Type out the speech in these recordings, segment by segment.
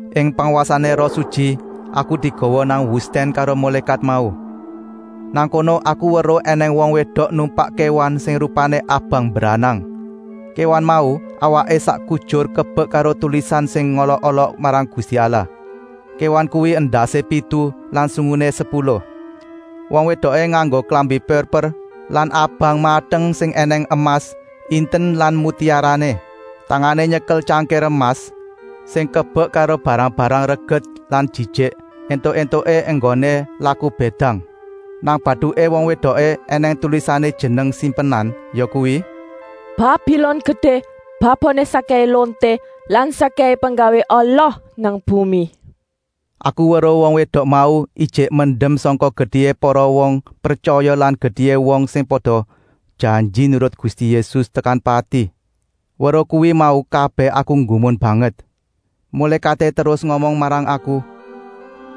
Ing pangwasané Roh Sutyi aku digawa nang wustèn karo mulékat mau. Nang kono aku weruh ènèng wong wédok numpak kéwan sing rupané abang mbranang. Kéwan mau awaké sak kujur kebek karo tulisan sing ngolok-olok marang Gusti Allah. Kéwan kuwi endasé pitu lan sunguné sepuluh. Wong wédoké nganggo klambi purper lan abang mateng sing ènèng emas, inten lan mutiarané. Tangané nyekel tyangkir emas sing kebek karo barang-barang reget lan jijik, éntuk-éntuké enggoné laku bédang. Nang batuké wong wédoké ènèng tulisané jeneng simpenan, yakuwi: “Babilon gedé, baboné sakkèhé lonté lan sakkèhé penggawé ala nang bumi.” Aku weruh wong wédok mau ijik mendem sangka getihé para wong pretyaya lan getihé wong sing wis pada janji nurut Gusti Yésus tekan pati. Weruh kuwi mau kabèh aku nggumun banget. Mulékaté terus ngomong marang aku: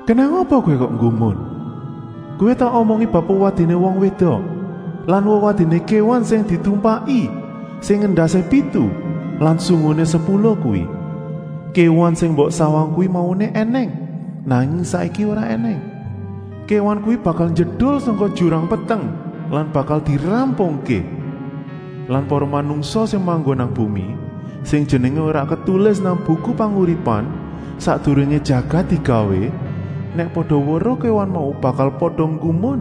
“Kenèng apa kowé kok nggumun? Kowé tak omongi bab wewadiné wong wédok lan wewadiné kéwan sing ditumpaki, sing endasé pitu lan sunguné sepuluh kuwi. Kéwan sing mbok sawang kuwi mauné ènèng, nanging saiki ora ènèng. Kéwan kuwi bakal njedul sangka jurang peteng lan bakal dirampungké. Lah para manungsa sing manggon nang bumi, sing jenengé ora ketulis nang Buku Panguripan sakdurungé jagat digawé, nèk pada weruh kéwan mau bakal pada nggumun.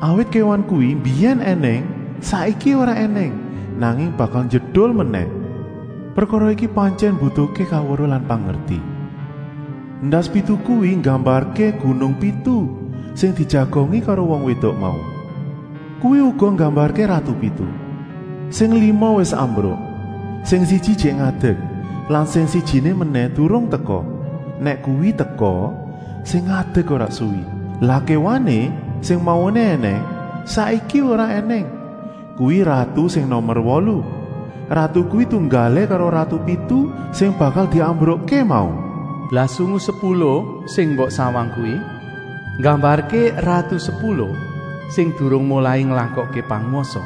Awit kéwan kuwi mbiyèn ènèng, saiki ora ènèng, nanging bakal njedul menèh. “Prekara iki pantyèn mbutuhké kaweruh lan pangerti. Endas pitu kuwi nggambarké gunung pitu sing dijagongi karo wong wédok mau. Kuwi uga nggambarké ratu pitu: sing lima wis ambruk, sing siji ijik ngadek lan sing sijiné menèh durung teka. Nèk kuwi teka, sing ngadek ora suwi. Lah Kéwané, sing mauné ènèng, saiki ora ènèng, kuwi ratu sing nomer wolu. Ratu kuwi tunggalé karo ratu pitu sing bakal diambrukké mau. “Lah sungu sepuluh sing mbok sawang kuwi nggambarké ratu sepuluh sing durung molai nglakokké pangwasa.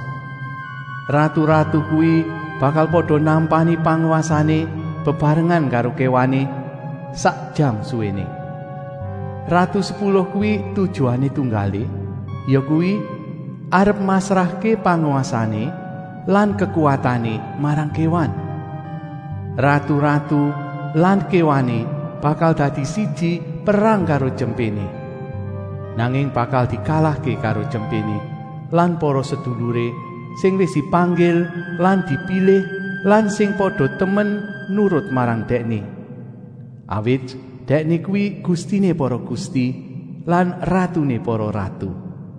Ratu-ratu kuwi bakal pada nampani pangwasané bebarengan karo kéwané, sak jam suwéné. Ratu sepuluh kuwi tujuané tunggalé, yakuwi, arep masrahké pangwasané lan kekuwatané marang kéwan. Ratu-ratu lan kéwané bakal dadi siji perang karo Tyempéné. Nanging bakal dikalahké karo Tyempéné lan para seduluré sing wis dipanggil lan dipilih lan sing pada temen nurut marang Dèkné. Awit Dèkné kuwi Gustiné para gusti lan Ratuné para ratu.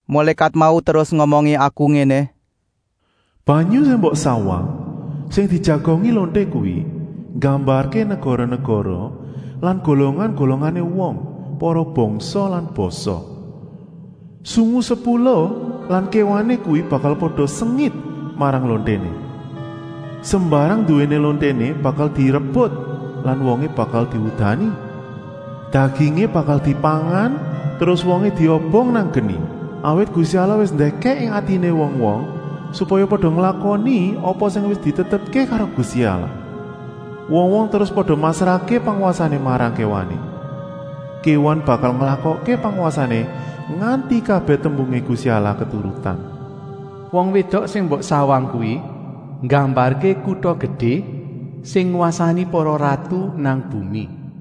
“Mulékat mau terus ngomongi aku ngéné: Banyu sing mbok sawang, sing dijagongi lonté kuwi, nggambarké negara-negara lan golongan-golongané wong, para bangsa lan basa. Sungu sepuluh lan kéwané kuwi bakal pada sengit marang lonténé. Sembarang nduwéné lonténé bakal direbut lan wongé bakal diudani. Dagingé bakal dipangan terus wongé diobong nang geni. Awit Gusti Allah wis ndèkèk ing atiné wong-wong, supaya pada nglakoni apa sing wis ditetepké karo Gusti Allah. Wong-wong terus pada masrahké pangwasané marang kéwané. Kéwan bakal nglakokké pangwasané nganti kabèh tembungé Gusti Allah keturutan. “Wong wédok sing mbok sawang kuwi nggambarké kuta gedé, sing ngwasani para ratu nang bumi.”